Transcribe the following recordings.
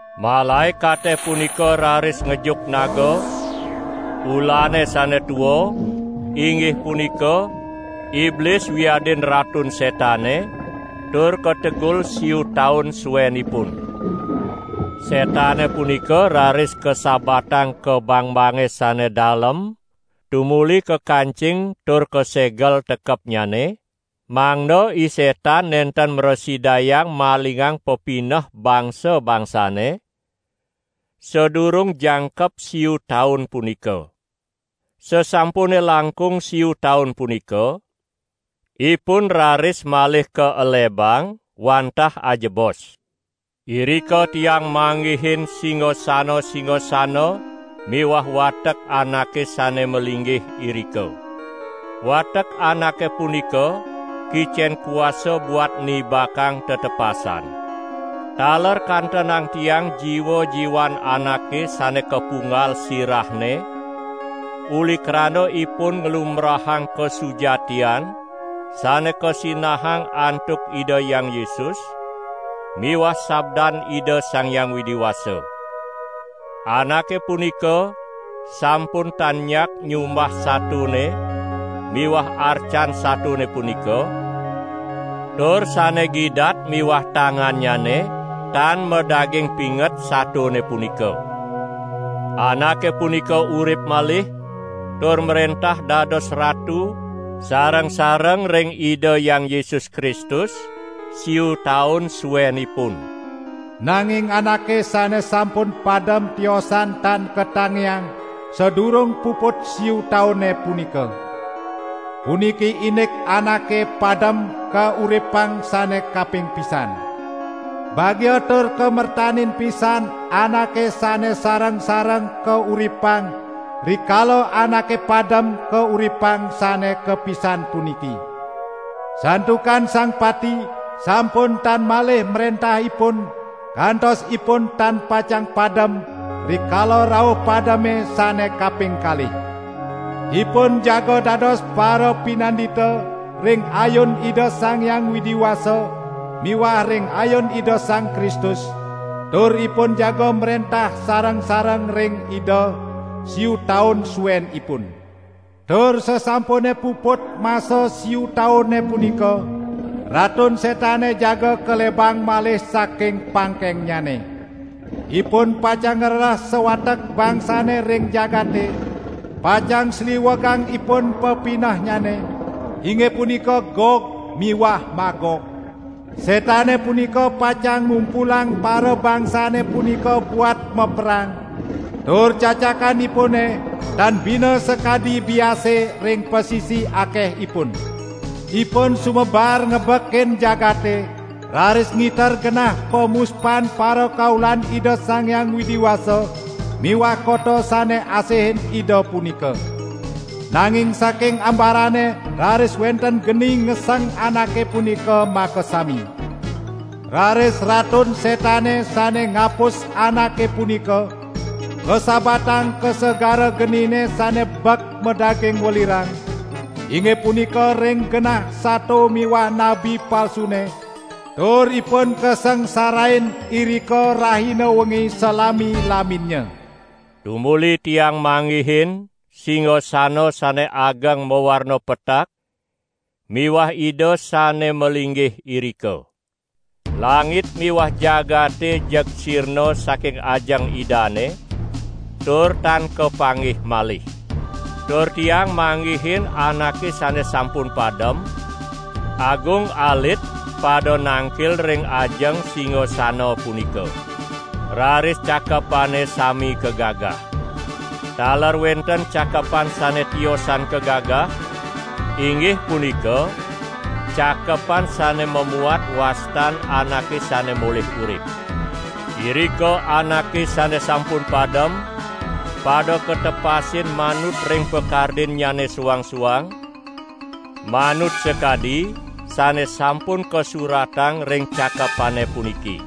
Malaekate punika raris ngejuk naga, ulane sane tua, inggih punika, Iblis wiadin Ratun Setane tur kategul siu taun suenipun. Setane punika raris kasabatang ka bangbange sane dalem tumuli kakancing tur kasegel tekepnyane, mangda I Setan nenten mrasidayang malingang pepineh bangsa-bangsane, sadurung jangkep siu taun punika. Sasampune langkung siu taun punika, ipun raris malih kaelebang wantah ajebos. Irika tiang manggihin singasana-singasana miwah watek anake sane malinggih irika. Watek anake punika kicen kuasa buat nibakang tetepasan. Taler kantenang tiang jiwa-jiwan anake sane kapunggal sirahne uli krana ipun nglumbrahang kasujatian sane kasinahang antuk Ida Hyang Yesus miwah sabdan Ida Sang Hyang Widi Wasa. Anake punika sampun tan nyak nyumbah satone miwah arcan satone punika tur sane gidat miwah tangannyane tan madaging pinget satone punika. Anake punika urip malih tur mrentah dados ratu sareng-sareng ring Ida Hyang Yesus Kristus siu taun suenipun. (Nanging anake sane sampun padem tiosan tan katangiang sadurung puput siu taune punika.) Puniki indik anake padem kauripang sane kaping pisan. Bagia tur kamertanin pisan anake sane sareng-sareng kauripang rikala anake padem kauripang sane kapisan puniki. Santukan sang pati sampun tan malih mrentah ipun kantos ipun tan pacang padem rikala rauh pademe sane kaping kalih. Ipun jaga dados parapinandita ring ayun Ida Sang Hyang Widi Wasa miwah ring ayun Ida Sang Kristus, tur ipun jaga mrentah sareng-sareng ring Ida siu taun suenipun. Tur sasampune puput masa siu taune punika, Ratun Setane jaga kalebang malih saking pangkengnyane. Ipun pacang ngrereh sawatek bangsane ring jagate, pacang sliwegang ipun pepinehnyane, inggih punika Gog miwah Magog. Setane punika pacang ngumpulang parabangsane punika buat maperang, tur cacakanipune tan bina sakadi biase ring pasisi akehipun. Ipun sumebar ngebekin jagate, raris ngiter genah pamuspan parakaulan Ida Sang Hyang Widi Wasa miwah kota sane asihin Ida punika. Nanging saking ambarane raris wenten geni ngeseng anake punika makasami. Raris Ratun Setane sane ngapus anake punika, kasabatang ka segara genine sane bek madaging welirang, inggih punika ring genah sato miwah nabi palsune, tur ipun kasangsarain irika rahina wengi salami-laminnya. Tumuli tiang manggihin singasana sane ageng mawarna petak miwah Ida sane malinggih irika. Langit miwah jagate jeg sirna saking ajeng Idane tur tan kapanggih malih. Tur tiang manggihin anake sane sampun padem, agung alit pada nangkil ring ajeng singasana punika. Raris cakepane sami kagagah. Taler wenten cakepan sane tiosan kagagah, inggih punika cakepan sane mamuat wastan anake sane molih urip. Irika anake sane sampun padem pada katepasin manut ring pakardinnyane suang-suang, manut sakadi sane sampun kasuratang ring cakepane puniki.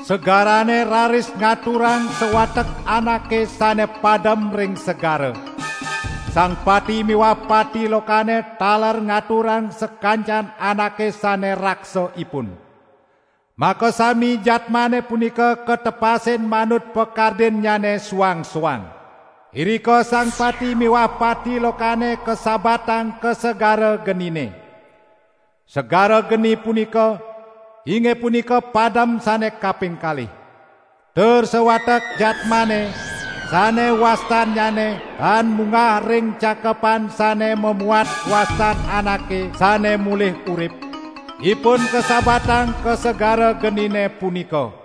Segarane raris ngaturang sawatek anake sane padem ring segara. Sang pati miwah pati lokane taler ngaturang sakancan anake sane raksa ipun. Makasami jadmane punika katepasin manut pakardinnyane suang-suang. Irika sang pati miwah pati lokane kasabatang ka segara genine. (Segara geni punika, inggih punika padem sane kaping kalih.) Tur sawatek jadmane sane wastannyane tan munggah ring cakepan sane mamuat wastan anake sane molih urip, ipun kasabatang ka segara genine punika.